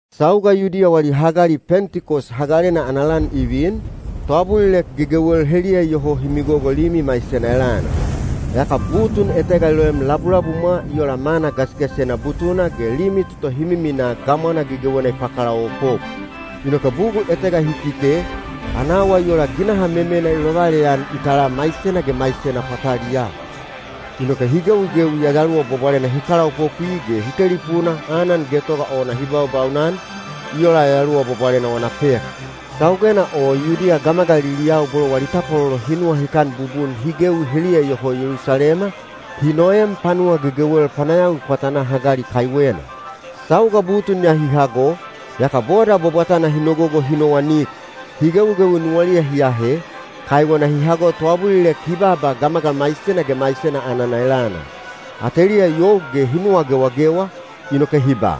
Sauga Yudiya wali hagali Pentikos Hagalena ana lan i vin, toabulilek gegewel heliya iyoho hi migogo limi maisena elana. Yaka butun etega i loem labulabumwa i ola mana gasigasisena butuna ge limi toto hi miminaa gamwana gegewena i pakalaopop. Inoke bugul etega hi kite, ana awa i ola ginaha memena i lovaleyan i tala maisena ge maisena pwataliyaa. Inoke hi gewigewi Yayaluwa Bwabwalena hi kalaopopwi ge hi telipuna anan getoga ona hi baubaunan, i ola Yayaluwa Bwabwalena wana pek. Saugena o Yudiya gamagaliliyau bolo wali tapwalolo hi nuwahikan bubun hi gewi heliya iyoho Yelusalema, hi noem panuwa gegewel panayawi pwatanaa hagali kaiwena. Sauga butun ya hi hago, yaka boda bwabwatana hi nogogo hi nowanik. Hi gewigewi nuwaliya hi ahe, kaiwena hi hago toabulilek hi baaba gamagal maisena ge maisena anana elana. Ateliya i you ge hi nuwa gewagewa, inoke hi ba,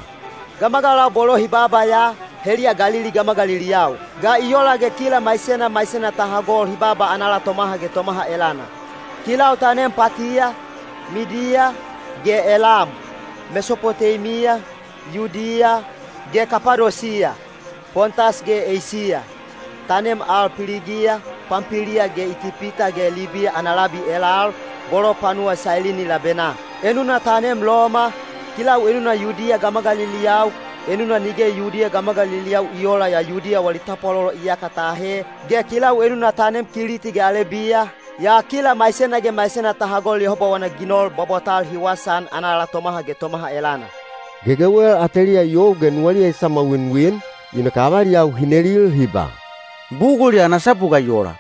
“Gamagalau bolo hi baaba ya, heliya Galili gamagaliliyau. Ga i ola ge kila maisena maisena ta hagol hi baaba anala tomaha ge tomaha elana? Kilau ta neem Patiya, Midiya, ge Elam; Mesopoteimiya, Yudiya, ge Kapadosiya; Pontas ge Eisiya; ta neem al Piligiya, Pampiliya ge Itipita ge Libiya ana labi elal, bolo panuwa Sailini labenaa. Enuna ta neem Loma, kilau enuna Yudiya gamagaliliyau, enuna nige Yudiya gamagaliliyau i oola yaa Yudiya wali tapwalolo iyaka ta ahe, ge kilau enuna ta neem Kiliti ge Alebiya—yaa kila maisena ge maisena ta hagol Yehoba wana ginol bwabwatal hi wasaan anala tomaha ge tomaha elana.” Gegewel ateliya i you ge nuwaliya i samwawinwin, inoke avaliyau hi nelil hi ba, “Bugul ya ana sapu ga i ola?”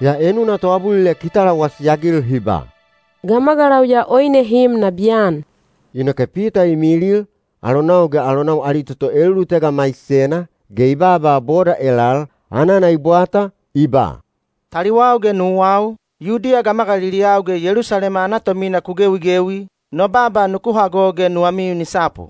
Yaa enuna toabulilek hi talawasi-agil hi ba, “Gamagalau ya oine hi im nabiyan.” Inoke Pita i milil, alonau ge alonau ali toto elulutega maisena, ge i baaba boda elal, anana i bwata, i ba, “Taliwau ge nuwau, Yudiya gamagaliliyau ge Yelusalema ana tomina ku gewigewi, no baaba nuku hago ge nuwamiu ni sapu.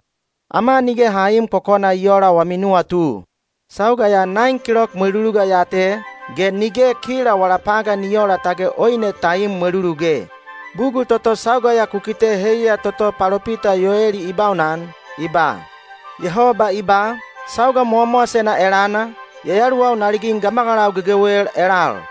Ama nige ha iim kokona i oola wami nuwatu. Sauga ya naen kilok mweluluga ya te, ge nige kila wala pagan i oola tage oine ta im mweluluge. Bugul toto sauga ya ku kite heiya toto palopita Yoeli i baunan, i ba: Yehoba i ba, ‘Sauga mowamowasena elana, Yayaluwau na ligin gamagalau gegewel elal.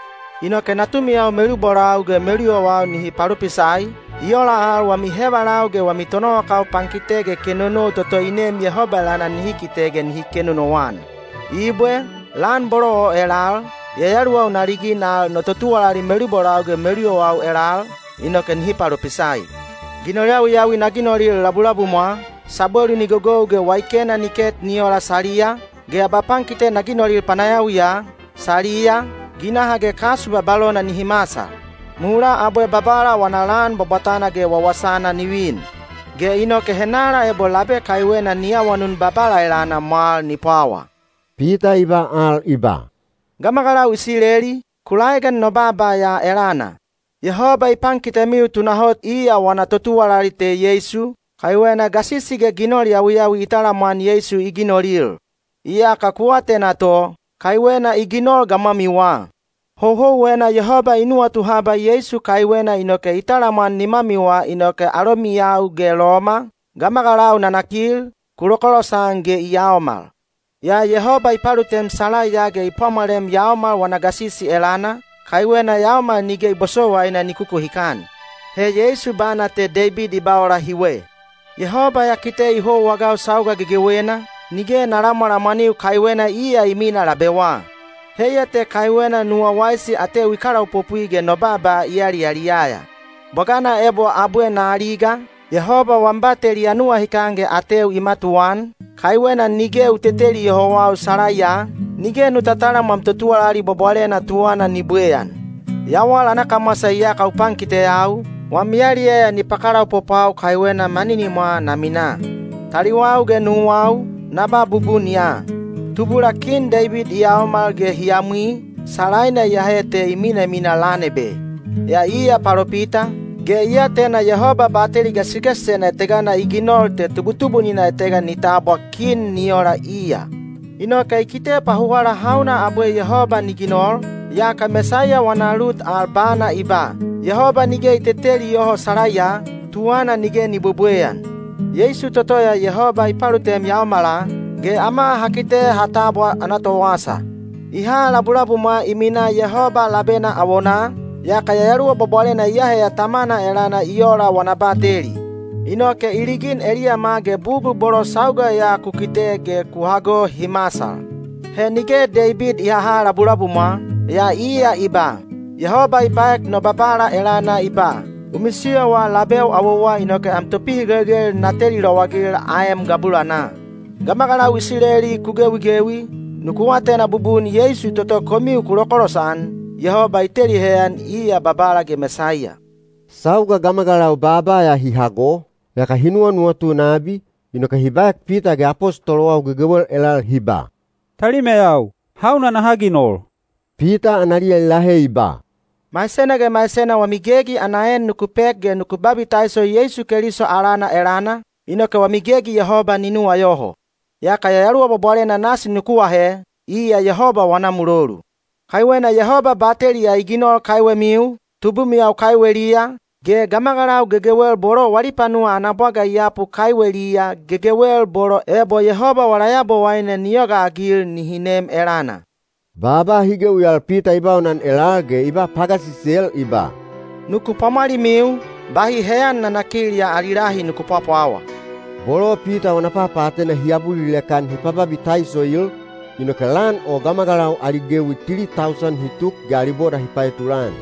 Inoke natumiyau melubolau ge meluyowau nihi palopisai, i ola al wami hevalau ge wami tonowakau pankite ge kenonou toto i neem Yehoba elana nihi kite ge nihi kenonouan. Ibwe, lan bolo o elal, Yayaluwau na ligin al no totuwalali melubolau ge meluyowau elal, inoke nihi palopisai. Ginol yawiyawi na ginolil labulabumwa, sabwelu ni gogou ge waikena ni ket ni ola saliya; ge abapankite na ginolil panayawiya, saliya, ginaha ge kasu babalona nihi masal. Bugul bolo o nihi masal, mulaa abwe Babala wana lan bwabwatana ge wawasana ni vin. Ge inoke henala ebo labe kaiwena ni awanun Babala elana mwal ni pwawa.’” Pita i ba al i ba, “Gamagalau Isileli, ku laegan no baaba ya elana! Yehoba i pankitemiu tunahot iya wana totuwalali te Yeisu, kaiwena gasisi ge ginol yawiyawi i talamwan Yeisu i ginolil. Iyaka ku atena to, kaiwena i ginol gamwamiwa. Houhouwena Yehoba i nuwatu haba Yeisu kaiwena inoke i talamwan nimamiwa inoke alomiyau ge Loma, gamagalau nanakil, ku lokolosan ge i yaomal. Yaa Yehoba i palutem salaiya ge i pwamwalem yaomal wana gasisi elana, kaiwena yaomal nige i bosowaina ni kukuhikan. He Yeisu bana te Deibid i ba ola hiwe: Yehoba ya kite i houwa-agau sauga gegewena, nige bugul etega ni papalamwalamwaniu-agau, kaiwena iya i minaa labeu awowa. Inoke nuwau i waisi ge no baaba i yaliyaliyaya. Bwagana ebo abwe na aliga, Yehoba wam bateli ya nuwahikan ge ateu i matuwaan, kaiwena nige nu teteli yohau salaiya, nige nu tatalam wam totuwalali bwabwalena tuwana ni bwebweyan. Yawal ana kamwasa iyaka u pankiteyau, wam yaliyaya ni pakalaopopwau kaiwena na minaa maninimwa. “Taliwau ge nuwau, na ba bubun ya. Tubula kin Deibid i yaomal ge hi yamwi, salaina iyahe te i minamina lan ebe. Yaa iya palopita, ge i atena Yehoba bateli gasigasisena etegana i ginol te tubutubunina etega ni tabwa kin ni ola iya. Inoke i kite pahuwala hauna abwe Yehoba ni ginol, yaka Mesaiya wana lut al bana i ba te Yehoba nige i teteli yoho salaiya, ge tuwana nige ni bwebweyan. Yeisu toto ya Yehoba i palutem yaomala, ge ama ha kite ha tabwa ana towasa. I ha labulabumwa i minaa Yehoba labena awonaa, yaka Yayaluwa Bwabwalena i aheya Tamana elana i ola wana bateli. Inoke i ligin eliyama ge bugul bolo sauga ya ku kite ge ku hago hi masal. He nige Deibid i haha labulabumwa, yaa iya i ba: Yehoba i baek no Babala elana i ba, ‘U misiyowa labeu awowa inoke am topihigelgel na teli lowagil aem gabulanaa.’ “Gamagalau Isileli ku gewigewi, nuku atena bubun Yeisu toto komiu ku lokolosan, Yehoba i teli heyan iya Babala ge Mesaiya.” Sauga gamagalau baaba ya hi hago, yaka hi nuwanuwatu nabi, inoke hi baek Pita ge apostolowau gegewel elal hi ba, “Talimeyau, hauna naha ginol?” Pita analiya i lahe i ba, “Maisena ge maisena wami gegi ana en nuku pek ge nuku babitaiso Yeisu Keliso alana elana, inoke wami gegi Yehoba ni nuwayoho. Yaka Yayaluwa Bwabwalena nasi nuku ahe, iya Yehoba wana mulolu. Kaiwena Yehoba bateli ya i ginol kaiwemiu, tubumiyau kaiweliya, ge gamagalau gegewel bolo wali panuwa ana bwaga i yapu kaiweliya— gegewel bolo ebo Yehoba wala Yabowaine ni yogaagil nihi nem elana.” Baaba hi gewi al Pita i baunan elal ge i ba pagasisel i ba, “Nuku pwamwalimiu, bahi heyan nanakil ya ali lahi nuku pwapwawa.” Bolo Pita wana papaatena hi abulilek-an hi pababitaisoil, inoke lan o gamagalau ali gewi tili tausan hi tuk ge ali boda hi paetulan.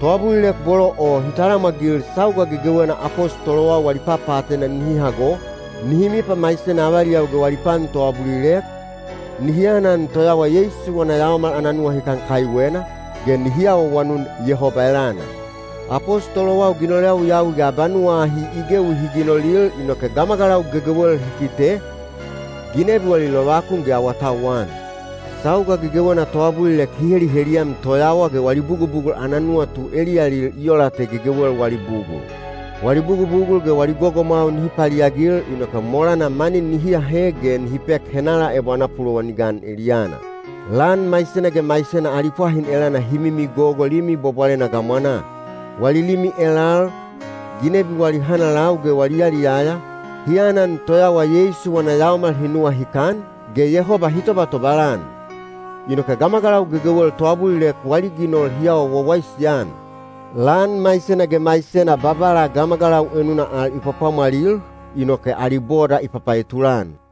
Toabulilek bolo o hi talamwagil sauga gegewena apostolowau wali papaatena nihi hago, nihi mipamaisena avaliyau ge wali pan toabulilek, nihi anan toyawa Yeisu wana yaomal ana nuwahikan kaiwena, ge nihi awaawanun Yehoba elana. Apostolowau ginol yawiyawi ge abanuwa ahi i gewi hi ginolil inoke gamagalau gegewel hi kite, ginebi wali lovakun ge awatauwan. Sauga gegewena toabulilek hi heliheliyam toyawa ge wali bugubugul ana nuwatu eliyalil i ola te gegewel wali bugul. Wali bugubugul ge wali gogomwau nihi paliagil inoke molana mani nihi ahe ge nihi pek henala ebo ana pulowan i gan eliyana. Lan maisena ge maisena ali pwahin elana hi mimigogo Limi Bwabwalena gamwanaa. Wali limi elal, ginebi wali hanalau ge wali yaliyaya, hi anan toyawa Yeisu wana yaomal hi nuwahikan, ge Yehoba hi tobatobal-an. Inoke gamagalau gegewel toabulilek wali ginol hi awa wawaisi-an. Lan maisena ge maisena Babala gamagalau enuna al i pwapwamwalil, inoke ali boda i papaetulan.